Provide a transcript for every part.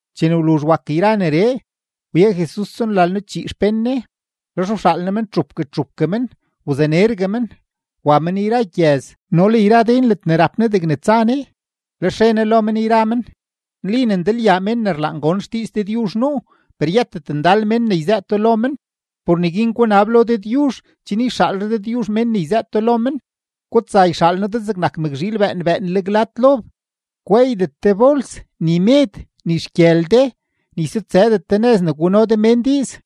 Chene wluzh wak yra neree, wye Jesus tsonlalno-chii xpén Ne; lex wxaal Ne men txupgue txupgue men, wzanergue men, wa men yra gyëz no le yra den ledne rap Ne degne tsa Ne. Lex re Ne lo men yra men: ―Nli ne ndalyaa mén ne rlaan gon xdiiz Dëdyuzh nuu, per yëtet ndal mén ne yzëëto lo men. Por neguin gunab lo Dëdyuzh chen yxaalre Dëdyuzh mén ne yzëëto lo men. Gutsa, yxaal noo de zegnak mëkzhiil bëën bëënleg lad lob. Gweeydet de bols, ni med, ni xgyël de, ni sutsëdet de nëz ne guno de mén diiz.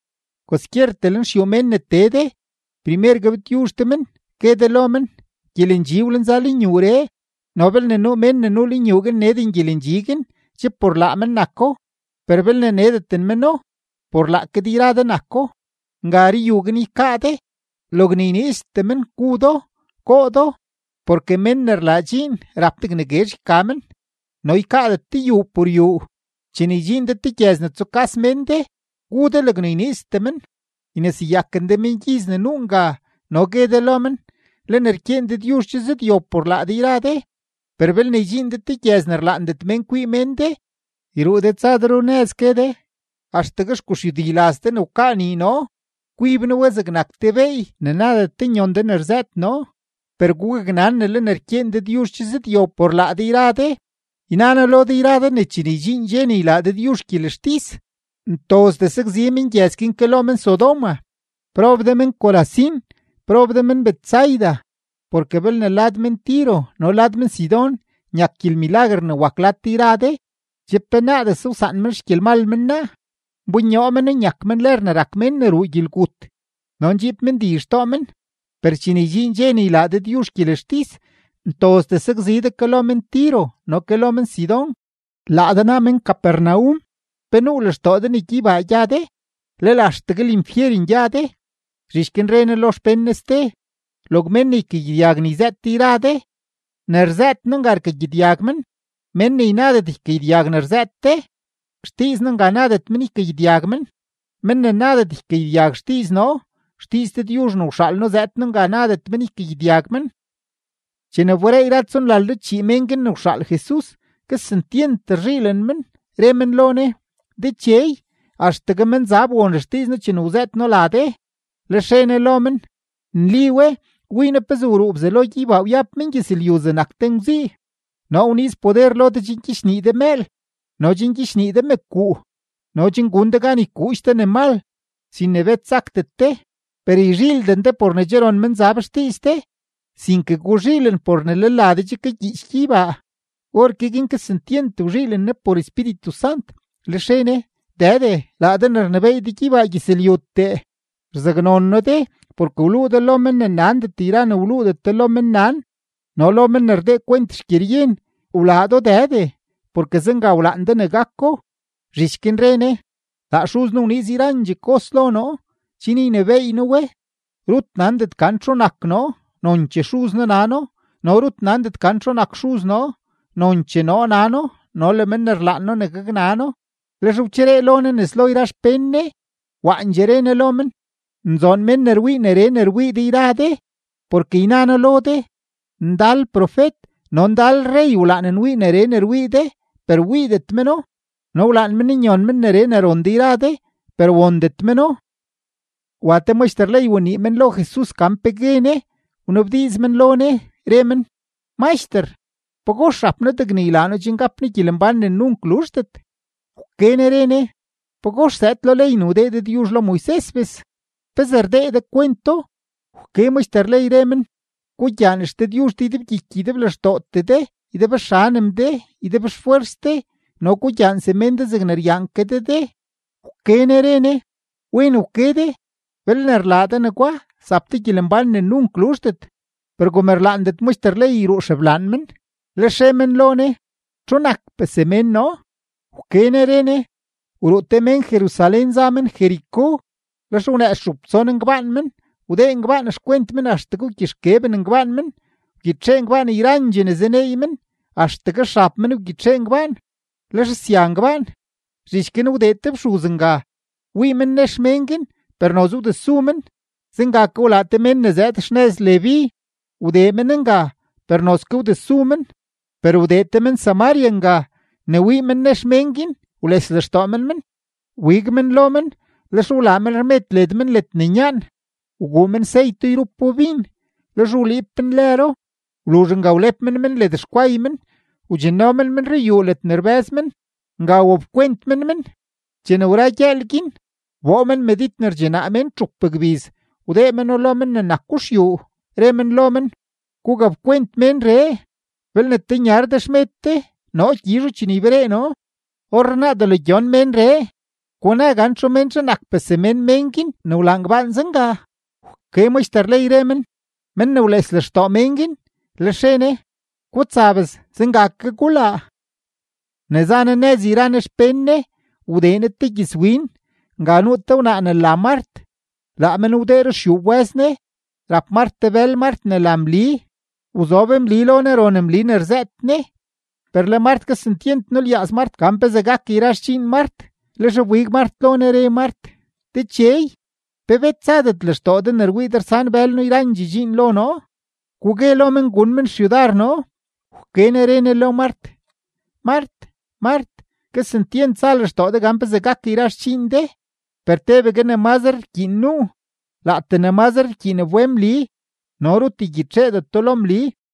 Kwaskyertee lenxyuu mén ne tee de, primer gabtyuzh de men, gue de lo men: “Gyelendxi wlenza lenyuuree.” No belne nuu mén ne nuu lenyuu guin neden gyelendxi guin, che por laa men nako; per belne nedendet meno, por laake de yra de nako. Nga ruyuu guin ykaa de, logne yniiztee men gu do, goo do, porke mén ne rlaa dxiin rap degne guezh yka men, no ykaadet de yuu por yuu. Chene ydxiin de te gyëz ne tsukas mén de, gu de logne yniiztee men; yneseyaken de mengyiz ne nuu nga, no gue de lo men: “Le ne rkyeen Dëdyuzh che zëdyob por laa de yra de.” Per belne ydxiin de te gyëz ne rlaandet mén kwii men de, yruu de tsa de runëz, gue de: “Axtegue xguxyudi laz de ne wkaa nii noo, kwib noo we zegnak te beey ne nadet de nyon de ne rzëët noo. Per gugaknan ne le ne rkyeen Dëdyuzh che zëdyob por laa de yra de.” Yna noo lo de yra de ne chene ydxiin dxe ne ylaa Dëdyuzh gyelextis, ntozdee sakzi mengyëz guin ke lo men-Sodoma. ’¡Prob de men-Corazín! ¡Prob de men-Betsaida! Porke belne lad men-Tiro no le lad men-Sidón nyak gyelmilaguer ne wak lad de yra de, che penaadese wsaan men xgyelmal men naa, nbonyoo meno nyak men lër ne rak mén ne ruu gyelgut no ndxiib men di xtoo men. Per chene ydxiin dxe ne ylaa Dëdyuzh gyelextis, ntozdee sakzi de ke lo men-Tiro no ke lo men-Sidón. Laa de naa men-Capernaum, ¿pe nuu lextoo de ne gyeybaa gya de? ¡Lel axtegue linfyeren gya de! Zhich guin re Ne lo xpén Ne ste: ―Log mén ne ykagyedyag ne yzëët de yra de, ne rzëët noo nga rkagyedyag men; mén ne ynadet ykagyedyag ne rzëët de, xdiiz noo nga nadet men ykagyedyag men; men ne nadet ykagyedyag xdiiz noo, xdiiz Dëdyuzh ne wxaal noo zëëd noo nga nadet men ykagyedyag men. Chene wberee yra tsonlalno-chii mén guin ne wxaal Jesus, kesentyent rzhiilen men, re men lo Ne: ―Dechey, axtegue menzab won xdiiz noo chene wzëët noo la de. Lex re Ne lo men: ―Nli we, wii noo pezee wruu Bzelo gyeybaa wyab men gyëzlyu zegnak te ngwzii. Noo wniiz poder lo de chen gyichnii de mëël no gyichnii de mëkuu no chen gun de gan ykuudx de ne mal, sin ne bet sakdet de. Per yzhiilden de por ne che ron menzab xdiiz de, sinke guzhiilen por ne le la de che kagyiich gyeybaa. Orke guin kesentyent wzhiilen Jesus por Espíritu Sant, lex re Ne: ―Dëde, laa de ne rnebééy de gyeybaa gyëzlyutee, rzaknon noo de porke wluu de lo men ne nandet yra ne wluudet de lo mennan no lo men ne rdee kwent xgyeryen. Wlaa do Dëde, porke zenga wlaan de ne gako. Zhich guin re Ne: ―Laa Xuz noo wniiz yrandxee kos lo noo chen ynebééy noo we. Rut nandet gan txu nak noo, nonchee Xuz noo nano; no rut nandet gan txu nak Xuz noo, nonchee noo nano no le men ne rlaan noo ne gaknano. Lex wcheree lo Ne nes lo yra xpén Ne, waandxee re Ne lo men: ―Nzoon mén ne rwii neree ne rwii de yra de. Porke yna noo lo de, ndal profet no ndal rrey wlaan nwii neree ne rwii de, per wiidet meno, no wlaan men nyon men neree ne ron de yra de, per wondet meno. Wa te maxter ley wanii men lo Jesus gan pe gue Ne, wnabdiiz men lo Ne, re men: ―Maxter, ¿pagox rap noo degne ylaa noo chen gap noo gyelembán ne nunk luzhdet? Wke Ne re Ne: ―¿Pagox zëëd lo ley ne wdee Dëdyuzh lo Moises bes? ¿Pezee rdee de kwento? Wke maxter ley, re men: ―“Gugyaan XDëdyuzh de ydebgyiky ydeblextootee de, ydebxanem de, ydebxfwers de, no gugyaan semén de zegne ryaan ke de de.” Wke Ne re Ne: ―Wen wke de. Belne rlaa de negwa, zap de gyelembán ne nunk luzhdet. Per kom rlaandet maxter ley yruu xeblaan men, lex re men lo Ne: ―¿Txu nakpee semén noo? Wke Ne re Ne: ―Wruu te mén Jerusalén za men Jericó, lex wnëëz txup tson ngbaan men, wdee ngbaan xkwent men axtegue wgyixkeben ngbaan men; wgyitxee ngbaan yrandxee ne zaneey men, axtegue xab men wgyitxee ngbaan, lex sya ngbaan. Zhich guin wdee te fxuz nga, wii men nex men guin, per noze wdesu men. Zenga ke wlaa te mén ne zëëd xnëz Leví, wdee men nga, per nozke wdesu men. Per wdee te men-Samaria nga; ne wii men nex men guin, wles lextoo men men; wbig men lo men, lex wlaa men rmed led men ledne nyaan, wguu men seyto yrupo bin, lex wliib men lëro. Wluzh nga wlep men men led xkway men, wdxinno men men ruyuu ledne rbë́z men; nga wapkwent men men. Chene wra gyëël guin, wboo men medid ne rdxinaa mén txup gbiz, wdee meno lo men ne nako xyuu, re men lo men: “Gugapkwent ménree; belne tenyar de xmed de, noo gyizho chene yberee noo.” Orrenaa, delo gyon ménree, guna gan ¿txu menzhe nakpee semén mén guin ne wlaa ngbaan zenga? Wke maxter ley, re men: ―Men ne wles lextoo mén guin. Lex re Ne: ―Gutsa bes, zenga ke gulaa. Ne za Jesus nëz yra Ne xpén Ne, wdee Ne te gyëzwin; nga nuu te wnaa ne la Mart. Laa men wdee ruxyuu wbë́z Ne. Rap Mart te bël Mart ne la Mli; wzob Mli lo Ne, ron Mli ne rzëët Ne. Per le Mart kesentyent nulyaaz Mart gan pezee gak yra xdxiin Mart, lex wbig Mart lo Ne, re Mart: ―Dechey, ¿pe bet zadet lextoo de ne rwii de rsan bël noo yrandxee dxiin lo noo? Gugue lo men gun men xyudar noo. Wke Ne re Ne lo Mart: ―Mart, Mart, kesentyent za lextoo de gan pezee gak yra xdxiin de. Per tebegue ne mazre rkyiin nuu. Laatee ne mazre rkyiindee wbe Mli, no rut ygyitxeedeto lo Mli.